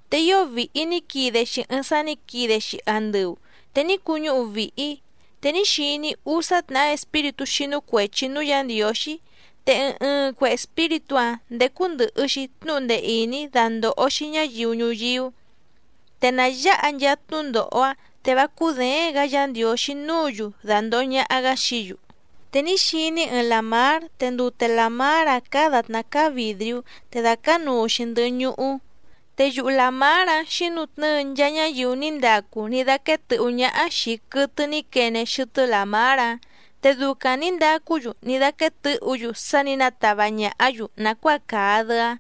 Te ío vìhi ní quide‑xi ɨɨⁿ sá nǐ quide‑xi andɨu te ní cuñúhu vìhi‑í, te ní xiní‑í úsá tnàhá espíritú xínú cuèchi núú Yǎ Ndiǒxí, te ɨɨⁿ ɨɨⁿ cue espíritú‑áⁿ ndécú ndɨ̀hɨ‑xi tnúhu ndee ìní dandòho‑xi ñáyiu ñuyíú, te nà yáha nchaa tnúndòho‑áⁿ, te vá cúděéⁿ‑gǎ Yǎ Ndiǒxí núǔ‑yu dàndoho ñaha‑gá xií‑yu. Te ní xiní‑í ɨɨⁿ làmár te ndute làmár‑áⁿ cáá dàtná cáá vìdriú, te dàcánuu‑xi ndɨhɨ ñuhú, te yuhu làmár‑áⁿ xǐnutnɨ́ɨ nchaa ñáyiu ní ndacu ní dáquéé tɨ̌hú ñáhá xìi quɨtɨ ní quene xɨtɨ́ làmár‑áⁿ, te ducaⁿ nǐ ndacú‑yu ní dáquéé tɨ̌hǔ‑yu sá nǐ natava ñàhá‑yu nàcuáa càa‑dɨ‑áⁿ,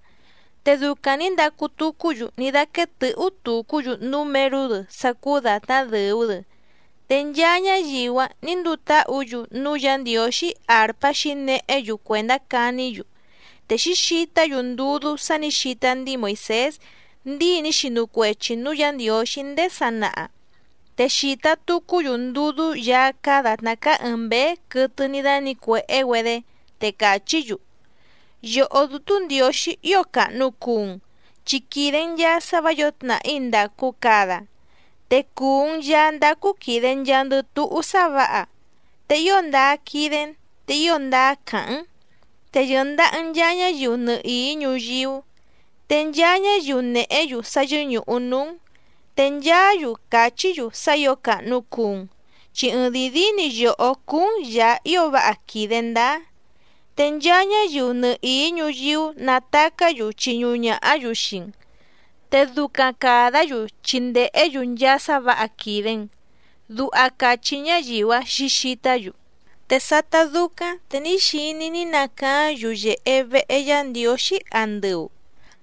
te ducaⁿ nǐ ndacu tucú‑yu ní dáquéé tɨ̌hú tucú‑yu númerú‑dɨ sá cúú dàtná dɨ̀u‑dɨ, te nchaa ñáyiu‑áⁿ nǐ nduu táhǔ‑yu núú Yǎ Ndiǒxí àrpá xǐnehé‑yu cuèndá caní‑yu. Te xǐxitá‑yu ndudú sá nǐ xita ndíi Moìsés ndíi ní xinu cuechi nǔú Yǎ Ndiǒxí ndéé sanaha, te xìta tucú‑yu ndudú Yaá cáá dàtná cáá ɨ̀ɨⁿ mbéé quɨtɨ ní dánǐcuèhé‑güedé, te càchí‑yu: Yòhó Dútú Ndiǒxí ío càhnu cuu‑n, chi quìde‑n nchaa sá vǎ yǒo tnàhí ndàcu cada, te cùu‑n Yaá ndácú quìde nchaandɨ túhú sá vǎha, te ío ndáá quídé‑n te ío ndáá càháⁿ‑n, te yɨ̀ndaha‑n nchaa ñáyiu nɨhìí ñuyíú. Te nchaa ñáyiu nèhé‑yu sá yɨ́ñùhu núú‑n, te nchaá‑yu càchí‑yu sá ǐo càhnu cuu‑n, chi ɨɨⁿdìi díí‑ni yòhó cúú‑n Yàá ío váha quìde ndáá, te nchaa ñáyiu nɨhìí ñuyíú natacá‑yu chiñuhu ñàhá‑yu xii‑n, te ducaⁿ càdá‑yu chi ndèhé‑yu nchaa sá vǎha quìde‑n. Duha càchí ñáyiu‑áⁿ xǐxitá‑yu. Te sátá dúcáⁿ te ní xiní‑í ní nacaáⁿ yuyèhe vehe Yá Ndiǒxí andɨu,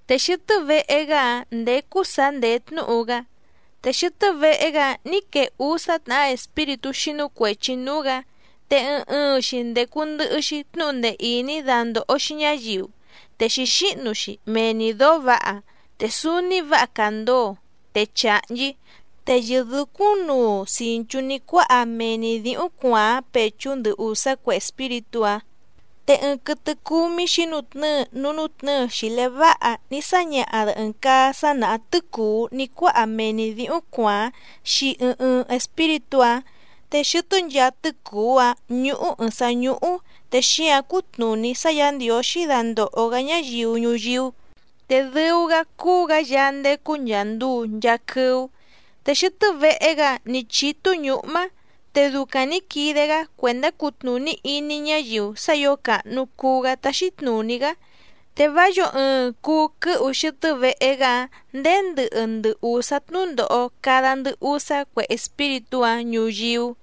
te xɨtɨ́ vehe‑gá‑áⁿ ndécú sǎ ndèé tnúhu‑gá. Te xɨtɨ́ vehe‑gá‑áⁿ nǐ quee úsá tnàhá espíritú xínú cuèchi núú‑gǎ, te ɨɨⁿ ɨɨⁿ‑xi ndècu ndɨhɨ‑xi tnúhu ndee ìní dandòho‑xi ñáyiu, te xǐxíhnu‑xi mee‑ni dǒó vǎha, te súúní vǎha càndoo, te chàhnchí, te yɨ̀dúcúⁿnuu cìnchú ní cuáha mee‑ni dǐhúⁿ cuàáⁿ pèchú ndɨ ùsá cue espíritú‑áⁿ. Te ɨɨⁿ quɨtɨ cúmí xǐnutnɨ́ɨ núú nútnɨ̌ɨ xìlé váha ní sáñaha‑dɨ ɨ̀ɨⁿ caa sá nàhá tɨ́cùú ní cuáha mee‑ni dǐhúⁿ cuàáⁿ xii ɨɨⁿ ɨɨⁿ espíritú‑áⁿ, te xɨtɨ́ nchaa tɨ́cùú‑áⁿ ñúhú ɨ̀ɨⁿ sá ñúhú te xíǎⁿ cútnùní sá Yǎ Ndiǒxí dandòho‑gá ñáyiu ñuyíú, te dɨu‑gá cúú‑gǎ Yaá ndécú nchàa nduu nchaa quɨ́ú. Te xɨtɨ́ vehe‑gá‑áⁿ nǐ chítú ñǔhmá, te ducaⁿ nǐ quide‑gá cuèndá cutnùní iní ñáyiu sá ǐo càhnu cuu‑gá táxí tnùní‑gá, te vá yǒo ɨɨⁿ cuu quɨ́hu xɨtɨ́ vehe‑gá‑áⁿ ndèé ndɨhɨ ndɨ ùsá tnúndòho cada ndɨ usá cue espíritú‑áⁿ ñuyíú.